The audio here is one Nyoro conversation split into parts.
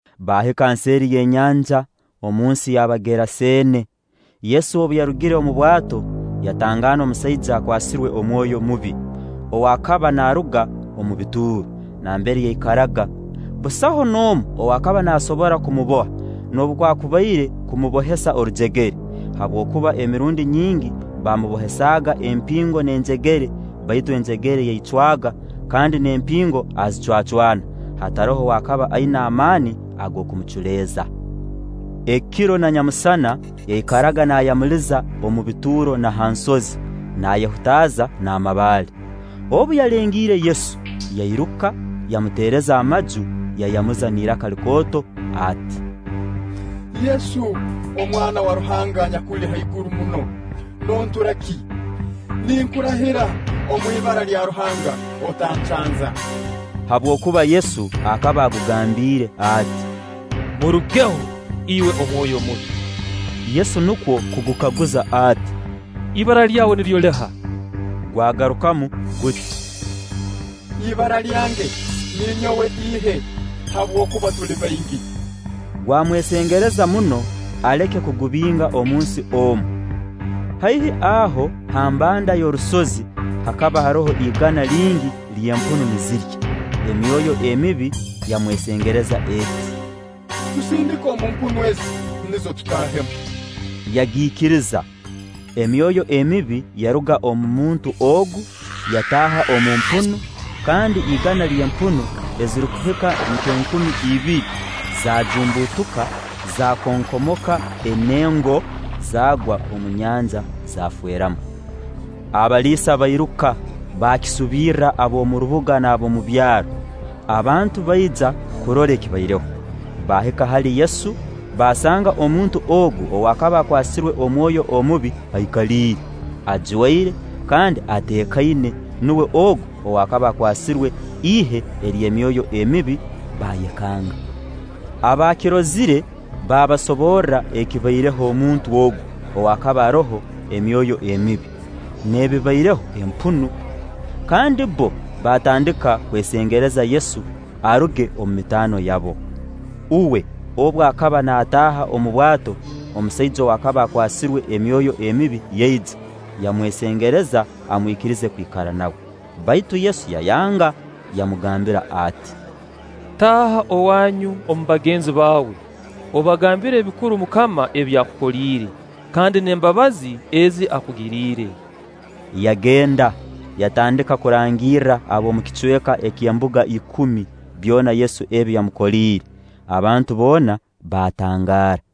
Baahika nseeri y'enyanja, omunsi y'Abageraseene. Yesu obu yarugire omu bwato, yatangaana omusaija akwasirwe omwoyo mubi, ow'akaba naaruga omu bituuro nambere yaikaraga. Busaho n'omu ow'akaba naasobora kumuboha noobwakubaire kumubohesa orujegere; habwokuba emirundi nyingi baamubohesaaga empingo n'enjegere, baitu enjegere yaicwaaga, kandi n'empingo azicwacwana; hataroho ow'akaba aina amaani ag'okumuculeeza. Ekiro na nyamusana yaikaraga naayamuliza omu bituuro na ha nsozi, naayehutaaza n'amabaale. Obu yalengiire Yesu, yairuka, yamuteereza amaju; yayamuza n'iraka likooto ati: “Yesu, Omwana wa Ruhanga anyakuli haiguru muno, noontura ki? Ninkurahira omu ibara lya Ruhanga, otancanza.” Habwokuba Yesu akaba agugambiire ati: “Murugeho, iwe omwoyo omubi!” Yesu nukwo kugukaguza ati: “Ibara Iyawe niryo liha?” Gwagarukamu guti: “Ibara lyange ninyowe Ihe; habwokuba tuli baingi.” Gwamwesengereza muno aleke kugubinga omunsi omu. Haihi aho ha mbanda y'orusozi hakaba haroho igana lingi ly'empunu nizirya; emyoyo emibi yamwesengereza eti: “Tusindike omu mpunu ezi, nizo tutaahemu.” Yagiikiriza. Emyoyo emibi yaruga omu muntu ogu, yataaha omu mpunu; kandi igana ly'empunu ezirukuhika nk'enkumi ibiri, zaajumbutuka, zaakonkomoka enengo, zaagwa omu nyanja, zaafeeramu. Abaliisa bairuka baakisubirra ab'omu rubuga n'ab'omu byaro. Abantu baija kurora ekibaireho. Baahika hali Yesu, baasanga omuntu ogu ow'akaba akwasirwe omwoyo omubi aikaliire, ajwaire, kandi ateekaine nuwe ogu ow'akaba akwasirwe ihe ery'emyoyo emibi; baayekanga. Abaakirozire baabasoborra ekibaireho omuntu ogu ow'akaba aroho emyoyo emibi, n'ebibaireho empunu. Kandi bbo baatandika kwesengereza Yesu aruge omu mitaano yabo. Uwe obu akaba naataaha omu bwato, omusaija ow'akaba akwasirwe emyoyo emibi yaija, yamwesengereza amwikirize kwikara nawe. Baitu Yesu yayanga, yamugambira ati: “Taaha owaanyu omu bagenzi baawe, obagambire ebikuru MUKAMA ebi akukoliire, kandi n'embabazi ezi akugiriire.” Yagenda yatandika kurangirra ab'omu kicweka ky'Embuga Ikumi byona Yesu ebi yamukoliire; abantu boona baatangaara.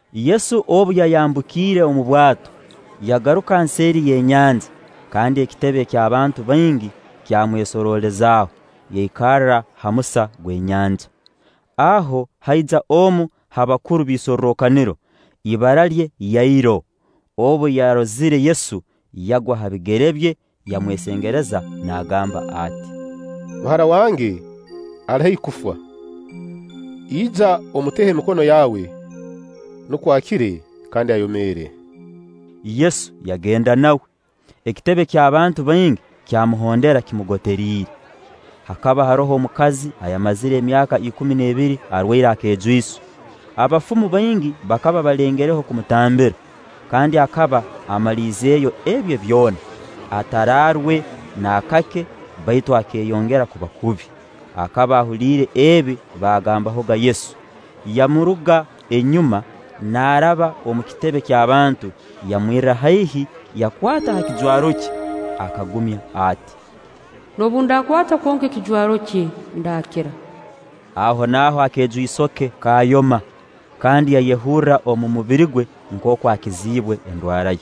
Yesu obu yayambukiire omu bwato, yagaruka nseeri y'enyanja, kandi ekitebe ky'abantu baingi kyamwesoroolezaaho; yaikara ha musa gw'enyanja. Aho haija omu ha bakuru b'isorrokaniro, ibara lye Yairo. Obu yarozire Yesu, yagwa ha bigere bye, yamwesengereza naagamba ati: “Muhara wange ali haihi kufa. Ija omuteho emikono yaawe, nukwo akire, kandi ayomeere.” Yesu yagenda nawe. Ekitebe ky'abantu baingi kyamuhondera kimugoteriire. Hakaba haroho omukazi ayamazire emyaka ikumi n'ebiri arwaire akejwiso. Abafumu baingi bakaba balengereho kumutambira, kandi akaba amaliizeyo ebye byona, ataraarwe naakake baitu akeeyongera kuba kubi. Akaba ahuliire ebi baagambahoga Yesu, yamuruga enyuma naaraba omu kitebe ky'abantu, yamwirra haihi, yakwata ha kijwaro kye. Akagumya ati: “Noobu ndakwataho kwonka ekijwaro kye ndaakira.” Ahonaaho akejwiso ke kaayoma; kandi yayehurra omu mubiri gwe nkooku akiziibwe endwara ye.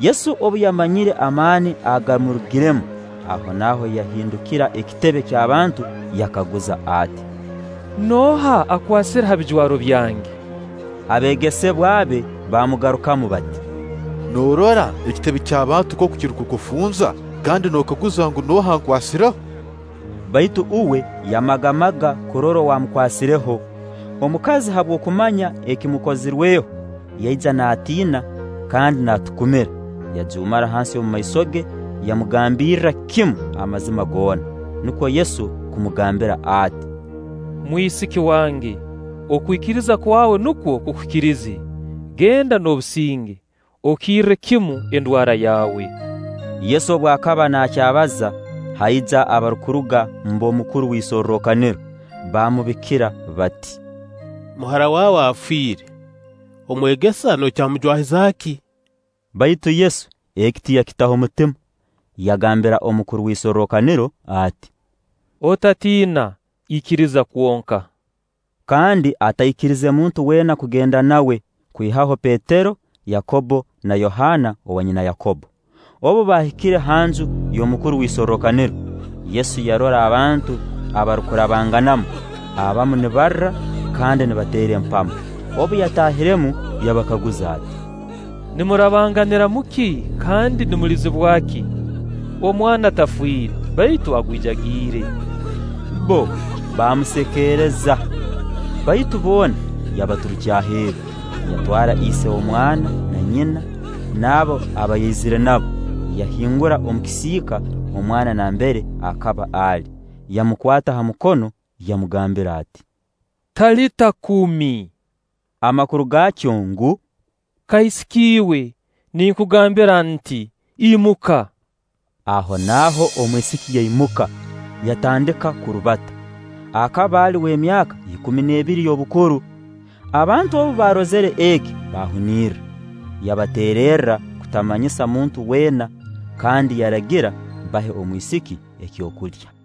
Yesu obu yamanyire amaani agamurugiremu, ahonaaho yahindukira ekitebe ky'abantu yakaguza ati: “Nooha akwasire ha bijwaro byange?” Abeegesebwa be baamugarukamu bati: “Noorora ekitebe ky'abantu nkooku kirukukufunza, kandi nookaguza ngu: ‘Nooha ankwasireho?’” Baitu uwe yamagamaga kurora ow'amukwasireho. Omukazi habw'okumanya ekimukozirweho, yaija naatiina kandi naatukumira, yajuumara hansi omu maiso ge, yamugambirra kimu amazima goona. Nukwo Yesu kumugambira ati: “Mwisiki wange, okwikiriza kwawe nukwo kukukirize; genda n'obusinge, okirre kimu endwara yaawe.” Yesu obu akaba naakyabaza, haija abarukuruga mb'omukuru w'isorrokaniro, baamubikira bati: “Muhara waawe afiire. Omwegesa nokyamujwahiza ki?” Baitu Yesu eki tiyakitaho mutima, yagambira omukuru w'isorrokaniro ati: “Otatiina, ikiriza kwonka.” Kandi ataikirize muntu weena kugenda nawe, kwihaho Petero, Yakobbo, na Yohaana owanyina Yakobbo. Obu baahikire ha nju y'omukuru w'isorrokaniro, Yesu yarora abantu abarukurabanganamu, abamu nibarra kandi nibateera empamo. Obu yataahiremu yabakaguza ati: “Nimurabanganiramu ki kandi nimulizibwa ki? Omwana tafiire, baitu agwijagiire.” Bbo baamusekeereza. Baitu boona yabaturukya aheeru, yatwara ise omwana na nyina, n'abo aba yaizire nabo, yahingura omu kisiika omwana nambere akaba ali. Yamukwata ha mukono, yamugambira ati: “Talita kuumi;” amakuru gaakyo ngu: “Kaisiki iwe, ninkugambira nti: Imuka.” Ahonaaho omwisiki yaimuka, yatandika kurubata; akaba ali w'emyaka ikumi n'ebiri y'obukuru. Abantu obu baarozire eki, baahuniira. Yabateererra kutamanyisa muntu weena, kandi yaragira bahe omwisiki ekyokulya.